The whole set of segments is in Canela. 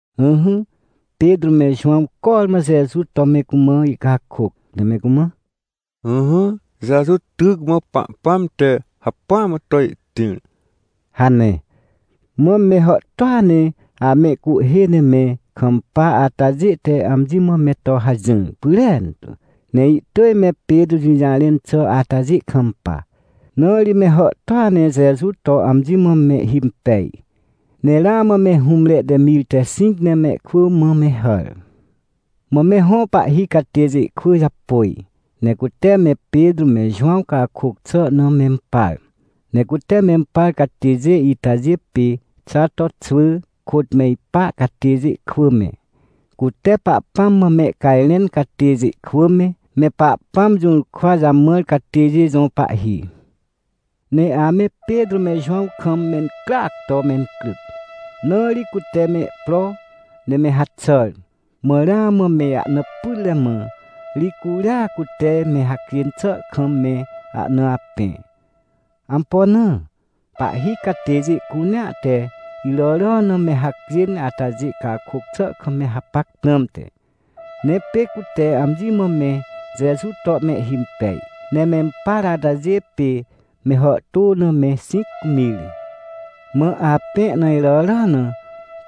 Ỹhỹ, Petrô me Jowãw cormã Jeju to me cumã ihcakôc, ne me cumã: — Ỹhỹ, Jeju tyc mã Pahpãm te hacpỹa mã to ihtĩr — hane. Mã me hàhtôa ne amehcuhhê ne me kampa atajê te amji mã me to hajỹr pyrentu, ne ihtỳj me Petrô jũjarẽn xà atajê kampa. Na ri me hàhtôa ne Jeju to amji mã mehhimpej, ne ramã me hũmre te mir te xĩc ne mehkwỳ mã me hàr. Mã me hõ pahhi catêjê kwỳ japôj, ne cute me Petrô me Jowãw cakôc xà na mempar. Ne cute mempar catêjê itajê pê Xato xwỳ kôt me ipa catêjê kwỳ me, cute Pahpãm mã mehcajrẽn catêjê kwỳ me, me Pahpãm jũrkwa jamãr catêjê jõ pahhi. Ne ame Petrô me Jowãw kam mencryac to mencryc. Na ri cute mehpro, ne me haxàr. Mã ramã me ahna pytre, mã ri curia cute me hacjên xà kam me ahna apẽ. Ampo na? Pahhi catêjê cunea te iràrà na me hacjên atajê cakôc xà kam me hapac prãmte. Ne pê cute amji mã me Jeju to mehhimpej, ne mempar atajê pê me hàhtô na me xĩc mir. Mã apẽ na iràrà na,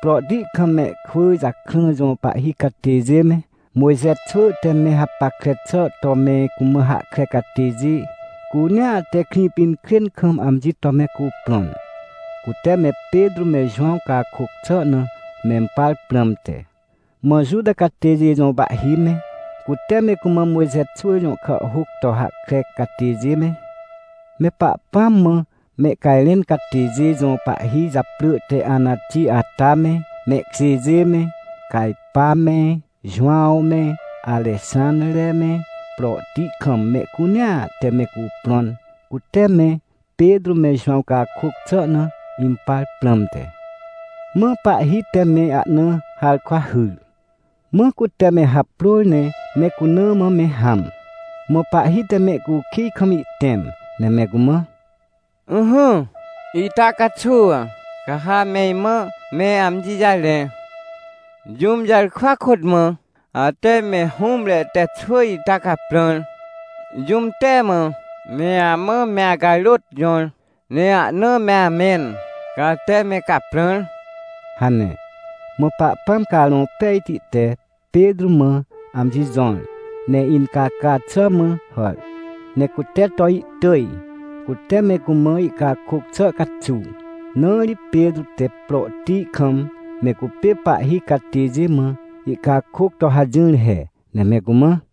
prohti kam mehkwỳ jakrã jõ pahhi catêjê me, Mojxe xwỳ te me hapackre xà to me cumã hahkre catêjê cunea te Krĩpinkrên kam amji to me cuprõn, cute me Petrô me Jowãw cakôc xà na mempar prãmte. Mã Juta catêjê jõ pahhi me, cute me cumã Mojxe xwỳ jõ kàhhôc to hahkre catêjê me, me Pahpãm mã mehcajrẽn catêjê jõ pahhi japrỳ te Anati ata me, mehkjêjê me, Cajpa me, Jowãw me, Arexãnre me, prohti kam mehcunea te me cuprõn, cute me Petrô me Jowãw cakôc xà na impar prãmte. Mã pahhi te me ahna harkwa hyr. Mã cute me haprôr ne me cuna mã me hãm. Mã pahhi te mehcukij kam ihtẽm, ne me cumã: — Ỹhỹ, ita caxuw ca ha me imã me amji jarẽ. Jũm jarkwa kôt mã ate me hũmre te xwỳ ita caprãr? Jũm te mã me amã me acarôt jõr ne ahna me amẽn, ca ate me caprãr? — hane. Mã Pahpãm Carõ Pejti te Petrô mã amji jõr, ne incaca xà mã hàr, ne cute to ihtỳj, cute me cumã ihcakôc xà caxuw. Na ri Petrô te prohti kam me cupê pahhi catêjê mã ihcakôc to hajỹr he, ne me cumã: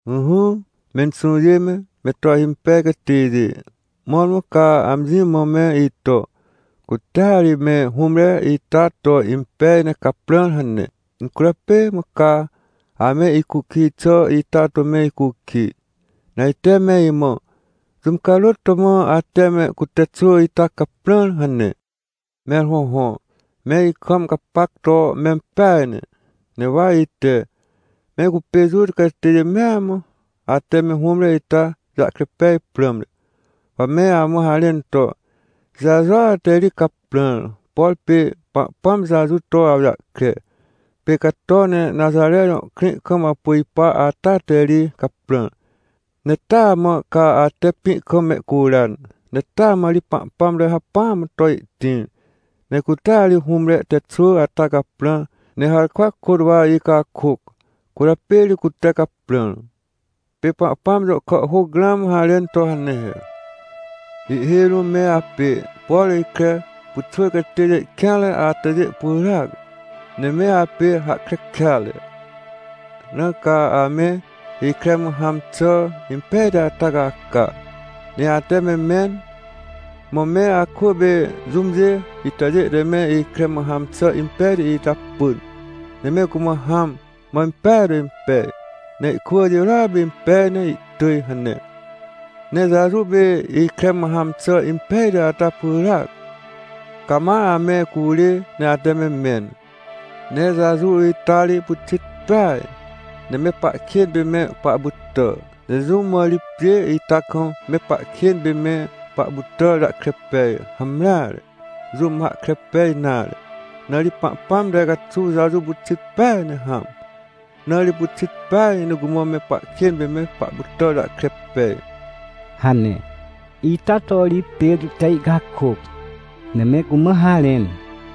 — Ỹhỹ, menxũjê me, me to ahimpej catêjê, mõrmõ ca amji mã me ito: “Cutea ri me hũmre ita to impej ne caprãr” hane, incwỳrjapê mã ca ame icukij xà ita to me icukij? Ne ajte me imã: “Jũm carôt to mã ate me cute xwỳ ita caprãr?” hane. Mẽr hõhõ, me ikam gapac to mempeaj ne. Ne wa ite, me cupê Juta catêjê mea mã, ate me hũmre ita jahkre pej prãmte, wa me amã harẽn to, Jejua te ri caprãr. Por pê Pahpãm Jeju to awjahkre, pê cato ne Naxare jõ krĩ kam apu ipa ata te ri caprãr. Ne taa mã ca ate pĩ kam mehcuran. Ne taa mã ri Pahpãm te hacpỹa mã to ihtĩr, ne cutea ri hũmre te xwỳ ata caprãr. Ne harkwa kôt wa icakôc, cwỳrjapê ri cute caprãr. — Pê Pahpãm jõ kàhhôc ramã harẽn to hane he: “Ihhêj rũm me apê, por ikre pyxwỳr catêjê kêanre atajê pyràac. Ne me apê hahkre kêatre. Na ca ame ikre mã hãm xà impejti ata caca, ne ate me mẽn. Mã me akwỳ pê jũmjê itajê te me ikre mã hãm xà impejti ita pỳn, ne me cumã hãm, mã impeaj to impej, ne ihkwỳ jirôa pê impej ne ihtỳj” hane. — Ne Jeju pê ikre mã hãm xà impejti ata pyràac. Ca ma ame curê ne ate me mẽn. Ne Jeju ita ri pyxit peaj, ne me pahkên pê me pahpytà. Ne jũm mã ri pjê ita kam me pahkên pê me pahpytàr jahkre pej? Hamreare, jũm mã hahkre pej nare. Na ri Pahpãm te caxuw Jeju pyxit peaj ne hãm. Na ri pyxit peaj ne cumã me pahkên pê me pahpytàr jahkre pej — hane. Ita to ri Petrô te ihcakôc, ne me cumã harẽn.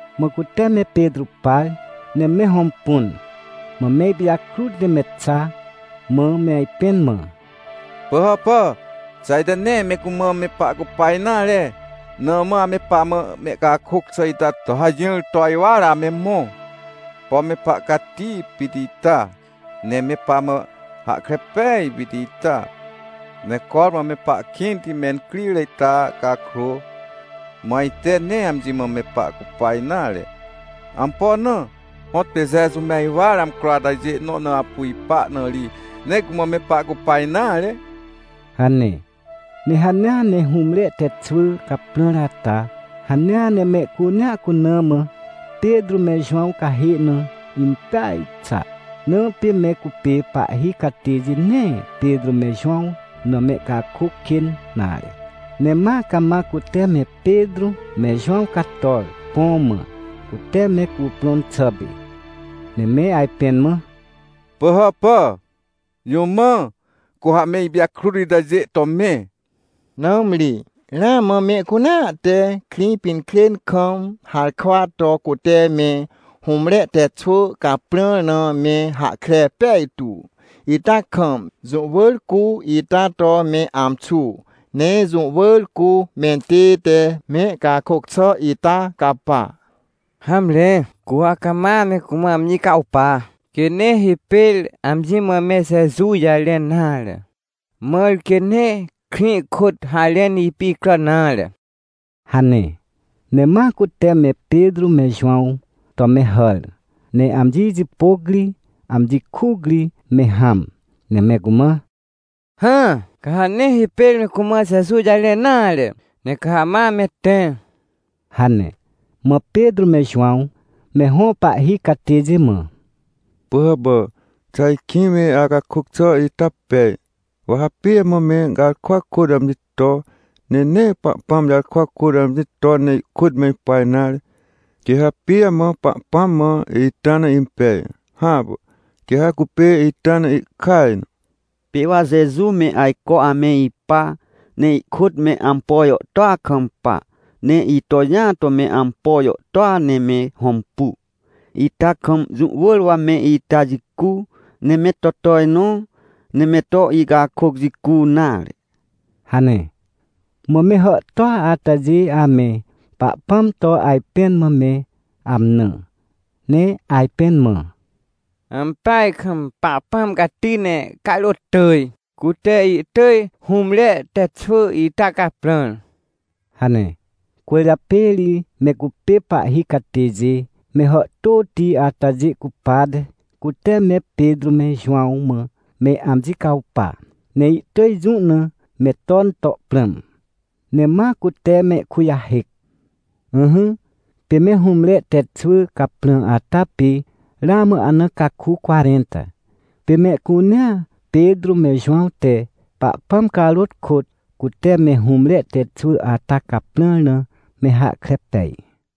Mã cute me Petrô par, ne me hõmpun, mã me ipijakrut ne me xa, mã me ajpẽn mã: — Pỳhàpà, xà ajte nee me cumã me pahcupa nare, na mã ame pamã mehcakôc xà ita to hajỹr to ajwar ame mõ? Pom me pahcati pit ita! Ne me pamã hahkre pej pit ita! Ne cormã me pahkĩnte mencrire ita cakrô, mã ajte nee amji mã me pahcupa nare. Ampo na? Hõtpê Jeju me ajwar amcro atajê nõ na apu ipa na ri, nee cumã me pahcupa nare — hane. Ne hanea ne hũmre te xwỳ caprãr ata, hanea ne mehcunea cuna mã Petrô me Jowãw cahê na impeaj xa. Na pê me cupê pahhi catêjê nee Petrô me Jowãw na mehcakôc kên nare. Ne ma cama cute me Petrô me Jowãw cator, põ mã, cute me cuprõn xà pê. Ne me ajpẽn mã: — Pỳhàpà, jũ mã cu ha me ipijakrut itajê to me? Nãmri ramã mehcunea te Krĩpinkrên kam harkwa to cute me hũmre te xwỳ caprãr na me hahkre pejtu ita kam. Jũ wỳr cu ita to me amxu, ne jũ wỳr cu mentête mehcakôc xà ita capa. Hamre, cu ha cama me cumã amji cawpa, quê nee hipêr amji mã me Jeju jarẽn nare. Mãr quê nee krĩ kôt harẽn ipicràn nare — hane. Ne ma cute me Petrô me Jowãw to me hàr, ne amji jipôc ri, amji kuc ri me hãm. Ne me cumã: — Hã, ca ha nee hipêr me cumã Jeju jarẽn nare, ne ca ha ma me tẽ — hane. Mã Petrô me Jowãw, me hõ pahhi catêjê mã: — Pỳhàpà, xà ajkĩ me acakôc xà ita pej? Wa ha pijamã me garkwa kôt amji to, ne nee Pahpãm jarkwa kôt amji ton ne ihkôt me ipa nare? Quê ha pijamã Pahpãm mã ita na impej? Hãpà, quê ha cupê ita na ihkaj na. Pê wa Jeju me ajco ame ipa, ne ihkôt me ampo jàhtôa kampa, ne ito jĩa to me ampo jàhtôa ne me hõmpu. Ita kam jũ wỳr wa me ita jicu, ne me to tojnõ, ne me to icakôc jicu nare — hane. Mã me hàhtôa atajê ame Pahpãm to ajpẽn mã me amnã, ne ajpẽn mã: — Ampeaj kam Pahpãm cati ne carôt tỳj, cute ihtỳj hũmre te xwỳ ita caprãr — hane. Cwỳrjapê ri me cupê pahhi catêjê, me hàhtôti atajê cupate, cute me Petrô me Jowãw mã me amji cawpa, ne ihtỳj jũ na me ton to prãm, ne ma cute mehkujahêc. Ỹhỹ, pê me hũmre te xwỳ caprã ata pê ramã ahna caku cwarẽnta. Pê mehcunea Petrô me Jowãw te Pahpãm carôt kôt, cute me hũmre te xwỳ ata caprãr na me hahkre pej.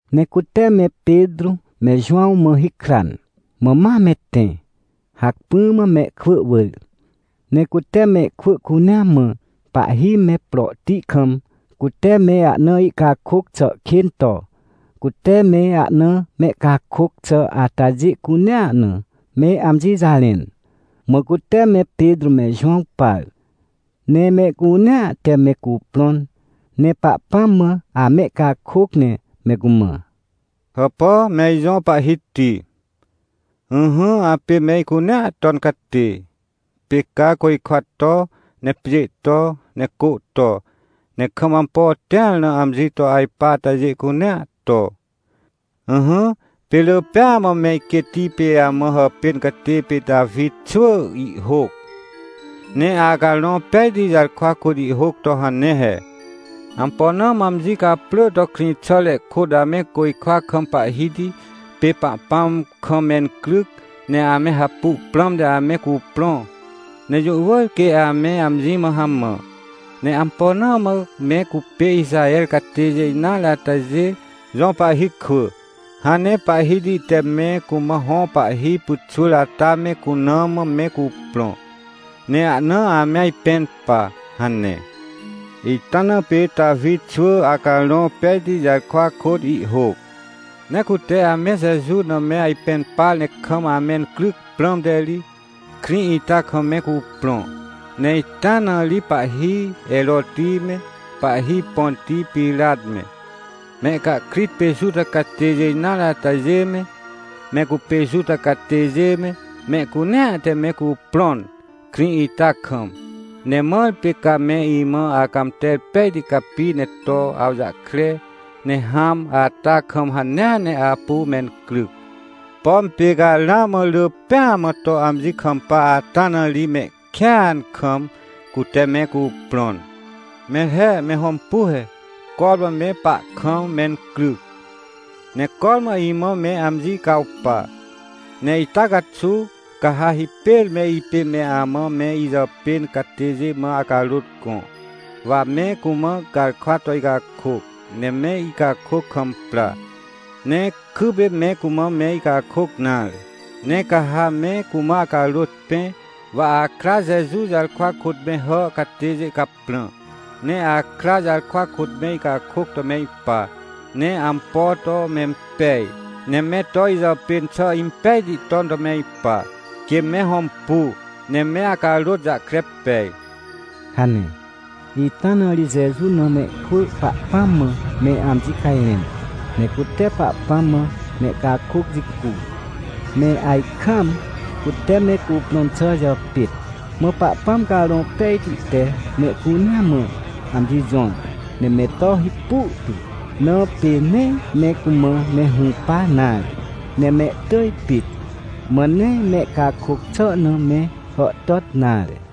Ne cute me Petrô me Jowãw mã hikran, mã ma me tẽ, hacpỹ mã mehkwỳ wỳr. Ne cute mehkwỳ cunea mã, pahhi me prohti kam, cute me ahna ihcakôc xà kên to, cute me ahna mehcakôc xà atajê cunea na, me amji jarẽn. Mã cute me Petrô me Jowãw par. Ne mehcunea te me cuprõn, ne Pahpãm mã amehcakôc ne me cumã: — Hàpà, me ijõ Pahhiti. Ỹhỹ, apê me icunea ton catê. Pê ca côjkwa to, ne pjê to, ne cô to, ne kam ampo tĩar na amji to ajpa atajê cunea to. Ỹhỹ, pê rỳ pêa mã me iquêtti pê amã hàpên catê pê Tawi xwỳ ihhôc, ne Acarõ Pejti jarkwa kôt ihhôc to hane he: “Ampo na mã amji caprỳ to krĩxàre kôt ame côjkwa kam Pahhiti pê Pahpãm kam mencryc ne ame hapu prãmte ame cuprõ? Ne jũ wỳr quê ame amji mã hamã. Ne ampo na mã me cupê Ixaher catêjê nare atajê jõ pahhi kwỳ, hãn ne Pahhiti te me cumã hõ pahhi pyxwỳr ata me cuna mã me cuprõ, ne ahna ame ajpẽn pa?” hane. — Ita na pê Tawi xwỳ, Acarõ Pejti jarkwa kôt ihhôc. — Ne cute ame Jeju na me ajpẽn par ne kam amencryc prãmte ri, krĩ ita kam me cuprõ. Ne ita na ri pahhi Heroti me, pahhi Ponti Pirat me, mehcahkrit pê Juta catêjê nare atajê me, me cupê Juta catêjê me, mehcunea te me cuprõn, krĩ ita kam. Ne mãr pê ca me imã Acãmter pejti capi ne to awjahkre, ne hãm ata kam hanea ne apu mencryc. Pom pê ca ramã rỳ pêa mã to amji kampa ata na ri mehkêan kam, cute me cuprõn. Mẽr he, me hõmpu he! Cormã me pahkam mencryc. Ne cormã imã me amji cawpa. Ne ita caxuw, ca ha hipêr me ipê me amã me ijàpên catêjê mã acarôt gõ, wa me cumã garkwa to icakôc, ne me icakôc kam pra, ne kypê me cumã me icakôc nare. Ne ca ha me cumã acarôt pẽ, wa akra Jeju jarkwa kôt me hà catêjê caprã. Ne akra jarkwa kôt me icakôc to me ipa, ne ampo to mempej, ne me to ijàpên xà impejti ton to me ipa, quê me hõmpu, ne me acarôt jahkre pej — hane. Ita na ri Jeju na mehkwỳ Pahpãm mã me amji cajrẽn. Ne cute Pahpãm mã mehcakôc jicu, me ajkaam cute me cuprõn xà jàpêt. Mã Pahpãm Carõ Pejti te mehcunea mã amji jõr ne me to hipu tu. Na pê nee me cumã me hũpa nare, ne mehtỳj pit. Mã nee mehcakôc xà na me hàhtàt nare.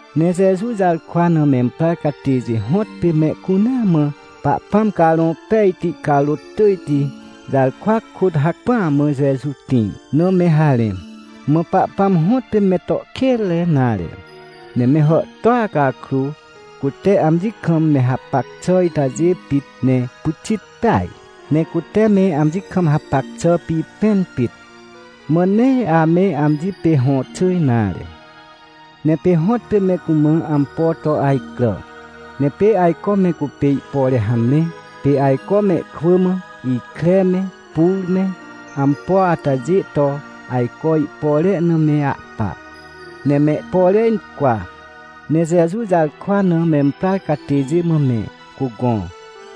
Ne Jeju jarkwa na memprar catêjê hõtpê mehcunea mã Pahpãm Carõ Pejti carôt tỳjti jarkwa kôt hacpỹa mã Jeju tĩr na me harẽ. Mã Pahpãm hõtpê me to kênre nare. Ne me hàhtôa cakrô, cute amji kam me hapac xà itajê pit, ne pyxit peaj, ne cute me amji kam hapac xà pipẽn pit. Mã nee ame amji pê hõxỳ nare. Ne pê hõtpê me cumã ampo to ajcrà. Ne pê ajco me cupê ihpore hamre, pê ajco mehkwỳ mã, ikre me pur me ampo atajê to ajco ihpore na me ahpa, ne mehpore incwa, ne Jeju jarkwa na memprar catêjê mã me cugõ.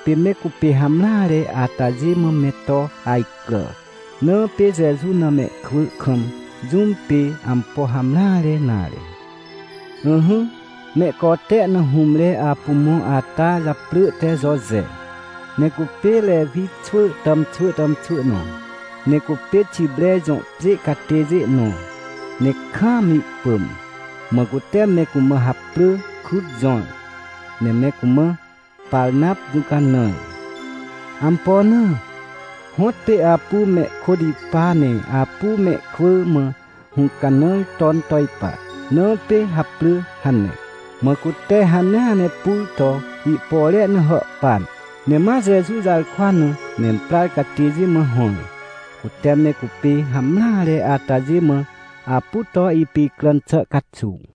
Pê me cupê hamreare atajê mã me to ajcrà. Na pê Jeju na mehkwỳ kam jũm pê ampo hamreare nare. Ỹhỹ, mehcote na hũmre apu mõ ata japrỳ te Joje. Ne cupê Rewi xwỳ tàmxwỳ tàmxwỳ nõ. Ne cupê Xipre jõ pjê catêjê nõ, ne kaam ihpỳm. Mã cute me cumã haprỳ krut jõr, ne me cumã “Parnap Jũcanãr”. Ampo na? Hõtpê apu mehkôt ipa ne apu mehkwỳ mã hũcanãr ton to ipa, na pê haprỳ hane. Mã cute hanea ne pur to ihpore na hàhpan, ne ma Jeju jarkwa na memprar catêjê mã hõr, cute me cupê hamreare atajê mã apu to ipicràn xà caxuw.